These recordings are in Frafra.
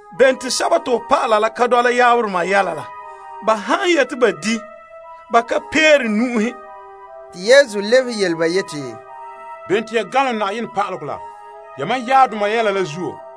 Bene te ho dɔlɔba la ka dɔla to sɔdoma yɛla la? Ba han ne yeti ba di', ba ka peere nu'uhe. Yesu lebehe yele ba yeti, Bene te ya ganlom Na'ayenɛ pa'alegɔ la, yamam sɔdoma yɛla la zuo?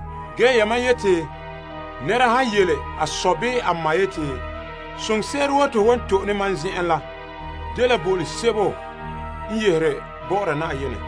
Ge yamam yeti te nɛra han yele a sɔ bii a ma yeti, soŋse'ere woo te ho wan to'e ne mam zen'en la dela bo'olom sebo n yehere bɔ'ɔra Yenɛ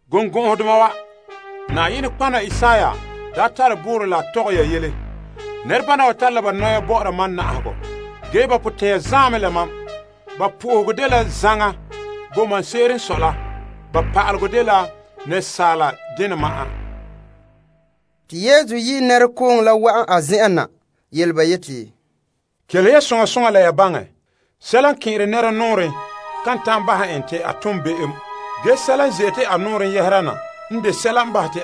Birikɔgɔdoma wa, Isaiah daa tare boorɔ la a porɛ ya yele: Nɛrebana wa na'aha mam la ba nɔya ma'an, ge ba suunre zaan mɛ la mam. Ba zoolom la te zɔta mam la dela asaala ze'elego te ba zamehɛ. Te Yesu daa yi' nɛrekooŋɔ la wa'an a zen'en na yele ba yeti, Kelehe ya soŋa soŋa la ya baŋɛ. Sɛla n kɛn'ɛre nɛra nɔɔrɛn ka ganlone en. Ge sɛla n ze'ete a nɔɔrɛn yɛhera na n de ganleŋɔ.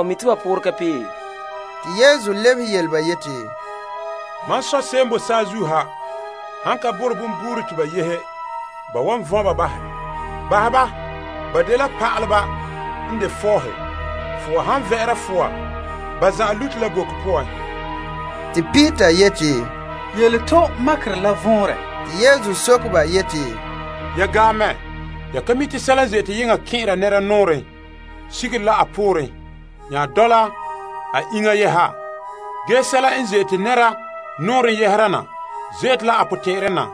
A lebehe yele ba yeti, Mam Sɔ' se'em n bo saazuo ha han ka borɛ bonbuure te ba yehe, ba wan vɔn' ba bahɛ. Bahɛ ba, ba dela pa'aleba n de fɔɔhe. Fowa han vɛ'ɛra fowa, ba zan'an lute la boko poan. Peter yeti, Yele to makerɛ la vɔnrɛ. Yesu soke ba yeti, Ya gaam mɛ? Ya ka mi' te sɛla n ze'ete yeŋa kɛn'ɛra nɛra nɔɔrɛn sigere la a pooren nya dɔla a iŋa yeha? Ge sɛla n ze'ete nɛra nɔɔrɛn yɛhera na ze'ete la a suunren na,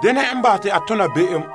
ge bama n de ganleŋɔ.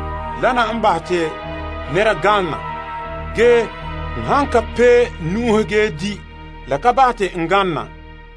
Wana n bahɛ te nɛra ganlona, ge a han ka pee nu'uhe ge di', la ka bahɛ te a ganlona.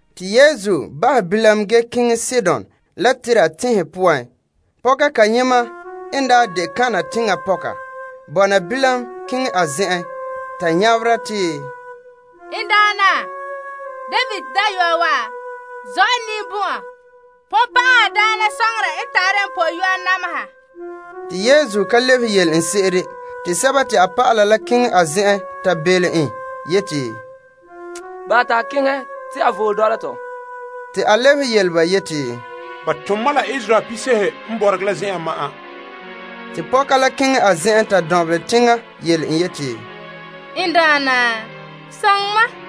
Te Yesu daa bahɛ bilam ge keŋɛ Sidon la Tire teŋhe poan. Pɔka kayema n daa de Kanaan teŋa pɔka bɔna bilam keŋɛ a zen'en te nyabera yeti, N Daana, David Dayɔa, zɔ' n ninbɔn'ɔn! Bonbe'a n tare n pɔyɔa nameha. Te Yesu ka lebehe yele en se'ere. Te a dɔlɔba la keŋɛ a zen'en ta belom en yeti, Bahɛ te a keŋɛ, te a voole dɔla tɔ. A lebehe yele ba yeti, Ba tom mam la Israel piise'ehe n bɔregɛ la zen'en ma'an. Pɔka la keŋɛ a zen'en ta dɔnbelɛ teŋa yele en yeti, N Daana, soŋɛ mam!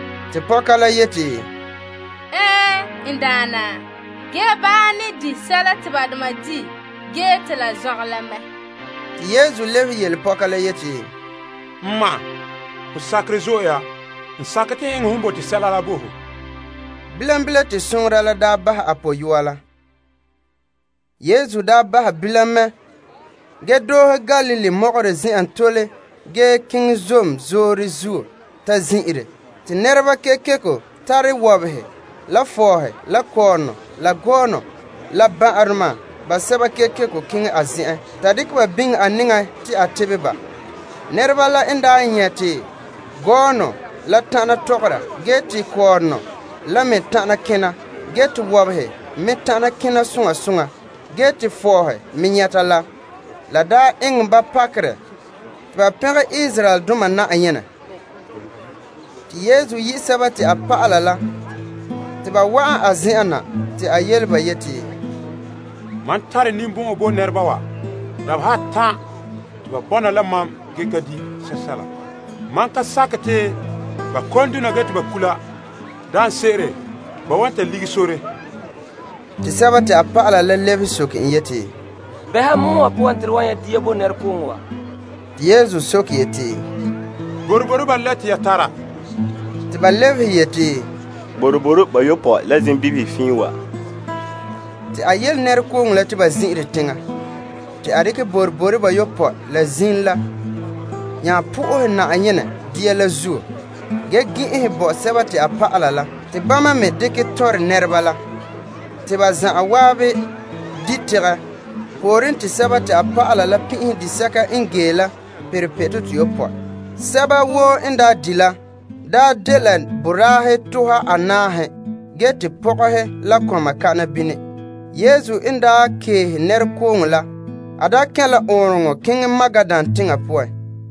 Pɔka la yeti, Ɛɛn, N Daana, ge baahe ne di' sɛla te ba doma di' gee te la zɔngɛ la mɛ. Yesu nya lebehe yele pɔka la yeti, N ma, ho sakerɛ zo'e ya! N sakɛ te n eŋɛ hon bote sɛla la bo ho. Bilam bilam, te a pɔyɔa la nyɛ' a tebegɔ. Yesu daa bahɛ bilam mɛ ge doohe Galilee mɔgɔrɛ zen'en tole ge keŋɛ zom zoore zuo ta zin'ire. Nɛreba kekeko tara wɔbehe la fɔɔhe la kɔɔrɔnɔ la gɔɔnɔ la ban'ahedoma basɛba kekeko keŋɛ a zen'en, te a tebɛ ba. Nɛreba la n daa nyɛ' te gɔɔnɔ la tana tɔgɔra, te kɔɔrɔnɔ la me tana kena, te wɔbehe me tana kena soŋa soŋa, te fɔɔhe me nyɛta la, la daa eŋɛ ba pakerɛ. Te ba pɛngɛ Israeldoma Na'ayenɛ. Yesu daa yi' a dɔlɔba la te ba wa'an a zen'en na te a yele ba yeti, Mam tare ninbɔn'ɔn bo nɛreba wa. Dabeha atan' te ba bɔna la mam ge ka di' sɛsɛla. Mam kan sakɛ te ba kon dona kula, daanse'ere ba wan ta lige sore. A dɔlɔba lebehe soke en yeti, Bɛha pɔgɔtia wa poan te to wan nyɛ' dia bo nɛrekooŋɔ wa? Yesu soke ba yeti, Boroboro ba lɛ te ya tara? Te ba lebehe yeti, Boroboro bayopɔe la zimbibihe fiin wa. Te a yele nɛrekooŋɔ la te ba zin'ire teŋa. Te a nya dekɛ boroboro bayopɔe la la zim la bo Na'ayenɛ fara ge gɛn'ɛnhɛ bo a dɔlɔba la, te bama me dekɛ tɔnrɛ nɛreba la. Te ba zan'an di' tegɛ. Pooren te a dɔlɔba la pin'ihe disɛka n gee la perɛ pitɔ toyopɔe. Sɛba woo n daa di' la daa dela boraahe tuha anaahe, ge pɔgɔhe la kɔma pa'ahɛ. Yesu n daa keehe nɛrekooŋɔ la, a kɛn' la ɔɔnrɔŋɔ poan keŋɛ Magadan teŋa poan.